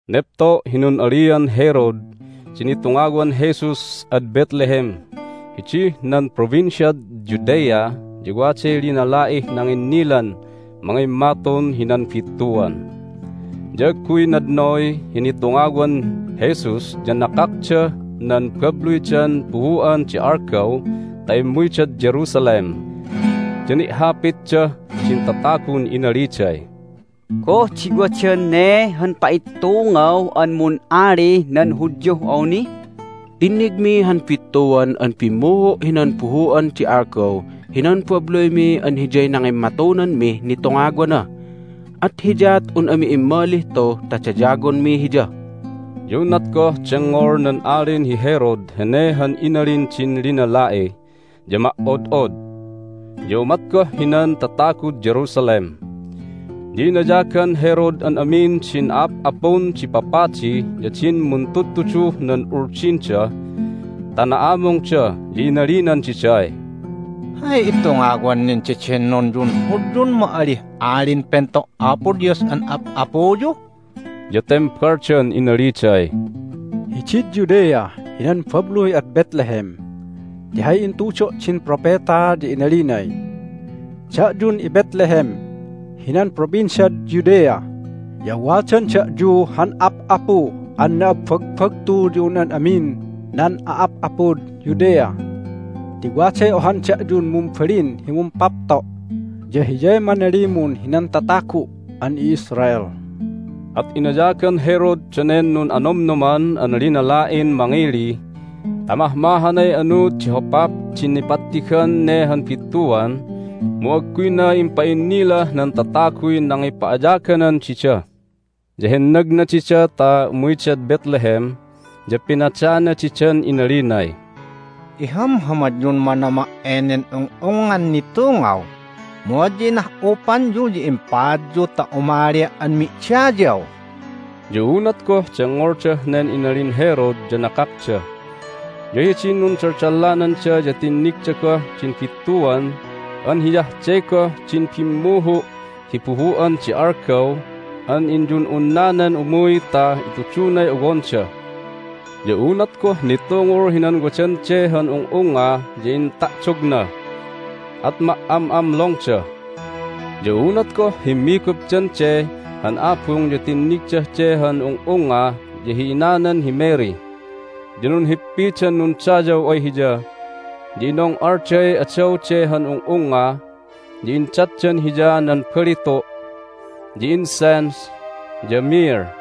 Nepto' hi nun'alian Herod di nitungawan Jesus ad Bethlehem hidih nan Provinciad Judea ya waday linala'ih nanginnilan mangimmatun hinan bittuan. Ya agguy nadnoy hi nitungawan Jesus ya nakakdah nan babluydan buhu'an di algaw ta immuydad Jerusalem. Ya ni'hapitdah din tatagun inaliday, "Goh di wadan ne han pa'ittungaw an mun'alih nan Hudyuh awni? Tinnigmi han bittuan an bimmuhu' hinan buhu'an di algaw hinan babluymi an hiyay nangimmatunanmih nitungawana, at hiyaat un ami immalih tu ta dayawonmi Hiya." Ya unat goh dengngol nan Alin hi Herod hene han inalin din linala'i ya ma"od'od, ya umat goh hinan tatagud Jerusalem. Ya inayagan Herod an amin din a'ap'apun di papadi ya din muntudtuduh nan Uldinda ta na'amungda, ya inalinan diday, "Hay itungawan nan dedennonyun Hudyun ma'alih Alin Pento' Apo Dios an ap'apuyu?" Ya tembaldan inaliday, "Hidid Judea hinan babluy ad Bethlehem, ti hay intudo' din propeta ya inalinay: Da'yun iBethlehem hinan Provinciad Judea ya wadan da'yu han ap'apu an na'abbagbagtu ya un an amin nan a'ap'apud Judea. Ti waday ohan da'yun mumbalin hi mumpapto', ya Hiyay manalimun hinan tatagu' an i'Israel." At inayagan Herod danen nun'anomnoman an linala'in mangili ta mahmahanay anuud di hopap di nipattigan ne han bittuan, mu agguyna impa'innilah nan tataguy nangipa'ayaganan dida. Ya hennagna dida ta umuydad Bethlehem, ya pinadana didan inalinay, "Ihamhamadyun manama' enen ung'ungngan nitungaw, mu adya inah'upanyu ya impaadyu ta umalia' an mi'dayaw." Ya unat goh dengngoldah nen inalin Herod ya nakakda. Ya hidin nundaldallananda ya tinnigda goh din bittuan an hiyah de goh din bimmuhu' hi buhu'an di algaw an inyun'unnanan umuy ta itudunay owonda. Ya unat goh nitungul hinan wadan de han ung'ungnga ya inta'dogna. At ma"am'amlongda! Ya unat goh himmigupdan de han abung ya tinnigdah de han ung'ungnga ya hi inanan hi Mary. Ya nunhippidan nundayaw ay Hiya, ya inong'alday adaw de han ung'ungnga, ya indatdan Hiya nan balitu', ya incense, ya myrrh.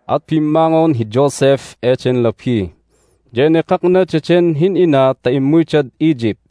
At bimmangon hi Joseph eden labi, ya enekakna daden hin'ina ta immuydad Egypt,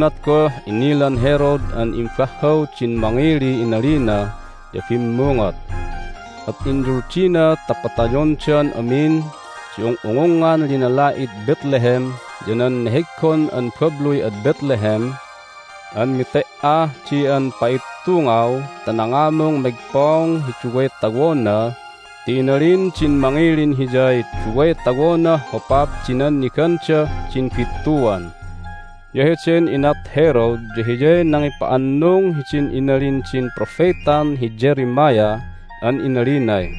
Unat goh inilan Herod an imbahhaw din mangiliy inalina ya bimmungot. At inyuldina ta patayondan amin di ung'ungungngan linala'id Bethlehem ya nan neheggon an babluy ad Bethlehem an mete"ah di an pa'ittungaw ta nangamung megpong hi duway tawona ti inalin din mangilin hiyay duway tawonah hopap di nannigandah din bittuan. Ya heden inat Herod ya hiyay nangipa'annung hidin inalin din propetan hi Jeremiah an inalinay,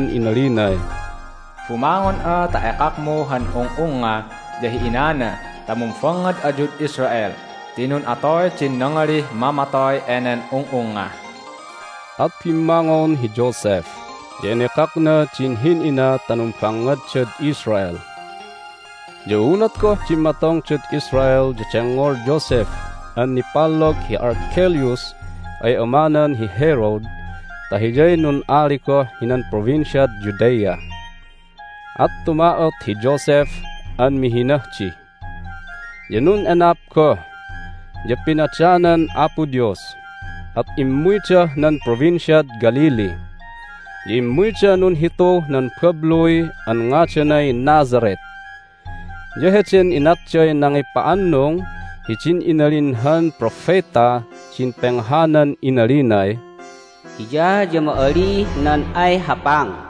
inalinay, "Bumangon'a ta ekakmu han ung'ungnga ya hi inana ta mumbangngad ayud Israel ti nun'atoy din nangalih mamatoy enen ung'ungnga." At bimmangon hi Joseph, ya enekakna din hin'ina ta numbangngaddad Israel. Ya unat goh dimmatongdad Israel ya dengngol Joseph an nipallog hi Archelaus ay amanan hi Herod ta hiyay nun'ali goh hinan Provinciad Judea, at tuma'ot hi Joseph an mihinah di. Ya nun'enap goh, ya pinadanan Apo Dios, at immuydah nan Provinciad Galilee. Ya immuyda nunhituh nan babluy an ngadanay Nazareth. Ya heden inatday nangipa'annung hidin inalin han propetah din penghanan inalinay Hiya ya ma'alih nan ay hapang.